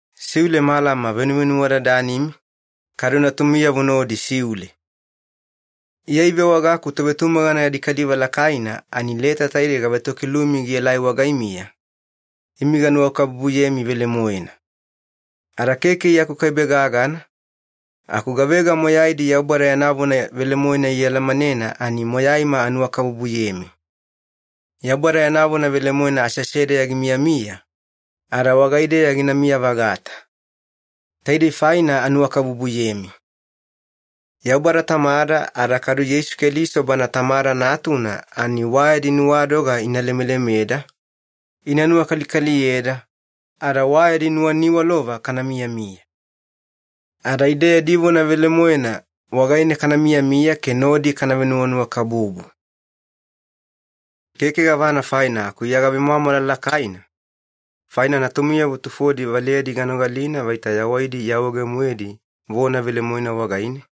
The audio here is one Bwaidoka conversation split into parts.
Siule malama venuvenuwadadanimi, kadu natumiyavo nodi siule. Iya ivewagaku tovetumagana yadi kaliva lakaina ani leta taide gavetokilumi gielai wagaimiya, imi ganuwakabubuyemi velemoena. Ada keke Iya akukaibe gagana, aku gavega moyaidi Yaubada yana vona velemoena ialamanena ani moyaima anuwakabubuyemi. Yaubada yana vona velemoena aseasedeya gimiyamiya, ada wagaideya ginamiya-vagata. Taidei faina anuwakabubuyemi. Yaubada Tamada ada kadu Yeisu Keliso Bana Tamada Natuna ani wa yadi nuwadoga ina lemelemeda, ina nuwakalikaliyeda, ada wa yadi nuwaniwalova kana miyamiya. Ada ide yadi vona velemoena wagaine kana miyamiya ke nodi kana venuwanuwakabubu. Keke gavana faina aku Iya gavemwamwala lakaina, faina natumiyavo tufodi valeyadi ganogalina vaita yawaidi iawaege-moedi vona velemoena wagaine,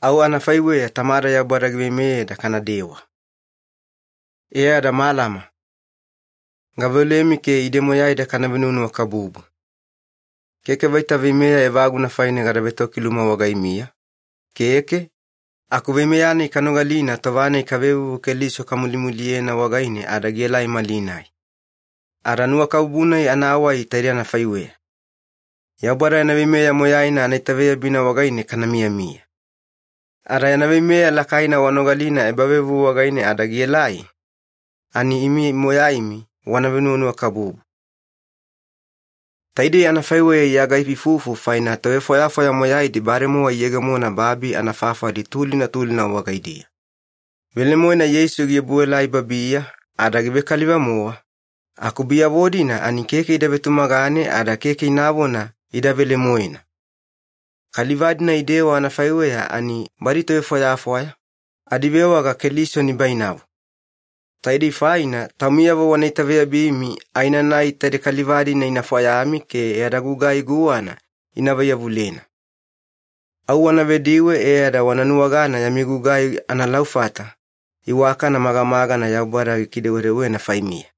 au anafaiweya Tamada Yaubada giveimeyeda kanadewa. E ada malama, gaveolemi ke ide moyaida kana venuwanuwakabubu. Keke vaita veimeya evaguna faine gada vetokiluma wagaimiya, keke, aku veimeya-nai kanogalina tova-nai kavevuvu Keliso kamulimuliyena wagaine ada gielai malinai. Ada nuwakabubu-nai anawai taide anafaiweya. Yaubada yana veimeya moyaina anaitaveyabina wagaine kana miyamiya. Ada yana veimeya lakaina wanogalina ebavevuvu wagaine ada gielai, ani imi moyaimi wana venuwanuwakabubu. Taidei anafaiweya Iya gaifuifufu faina tovefwayafwaya moyaidi bademowa iyegemona babi anafafali tulina tulina wagaidiya. Velemoena Yeisu giobuelai babiya ada givekaliva-mowa, aku biyavo-dina ani keke ida vetumagane ada keke inavona ida velemoena. Kaliva-dina idewa anafaiweya ani badi tovefwayafwaya, adivewaga ‘Keliso nibainavo’. Taidei faina taumiyavo wana itaveyabimi aenanai taide kaliva-dina ina fwayami ke yada gugai guwana ina vaiyavulena. Au wana vediwe e ada wana nuwagana yami gugai analaufata iwakana magamagana Yaubada gikidewedewena faimiya.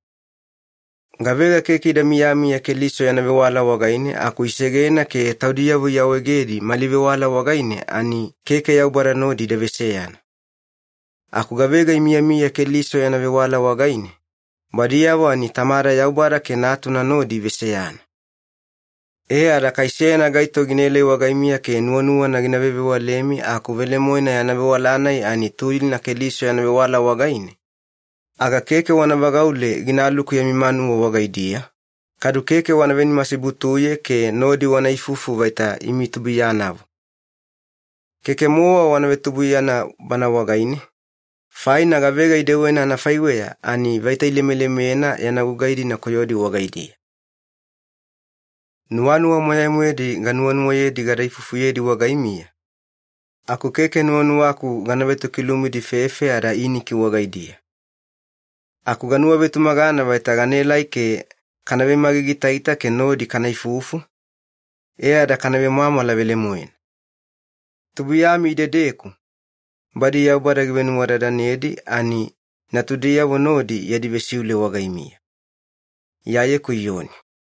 Gavega keke ida miyamiya Keliso yana vewala wagaine aku isegena ke taudiyavo iawaegedi mali vewala wagaine ani keke Yaubada nodi ida veseyana. Aku gavega imiyamiya Keliso yana vewala wagaine, badiyavo ani Tamada Yaubada ke Natuna nodi iveseyana. E ada kai seyana gaito ginaelai wagaimiya ke nuwanuwana gina vevewalemi aku velemoena yana vewala-nai ani tulina Keliso yana vewala wagaine, aga keke wana vagaule ginaluku yami manuwa wagaidiya, kadu keke wana venimasibutuye ke nodi wana ifufu vaita imi tubuiyanavo. Keke-mowa wana vetubuiyana bana wagaine, faina gavega idewena anafaiweya ani vaita ilemelemena yana gugai-dina koyodi wagaidiya. Nuwanuwa moyai-moedi ganuwanuwayedi gada ifufuyedi wagaimiya, aku keke nuwanuwaku gana vetokilumidi fefe ada iniki wagaidiya. Aku ganuwavetumagana vaita ganaelai ke kana vemagigiitaita ke nodi kana ifufu, e ada kana vemwamwala velemoena. Tubuiyami idedeku, badi Yaubada givenuwadadanedi ani natudiyavo nodi yadi vesiule wagaimiya. Iyayeku Iyoni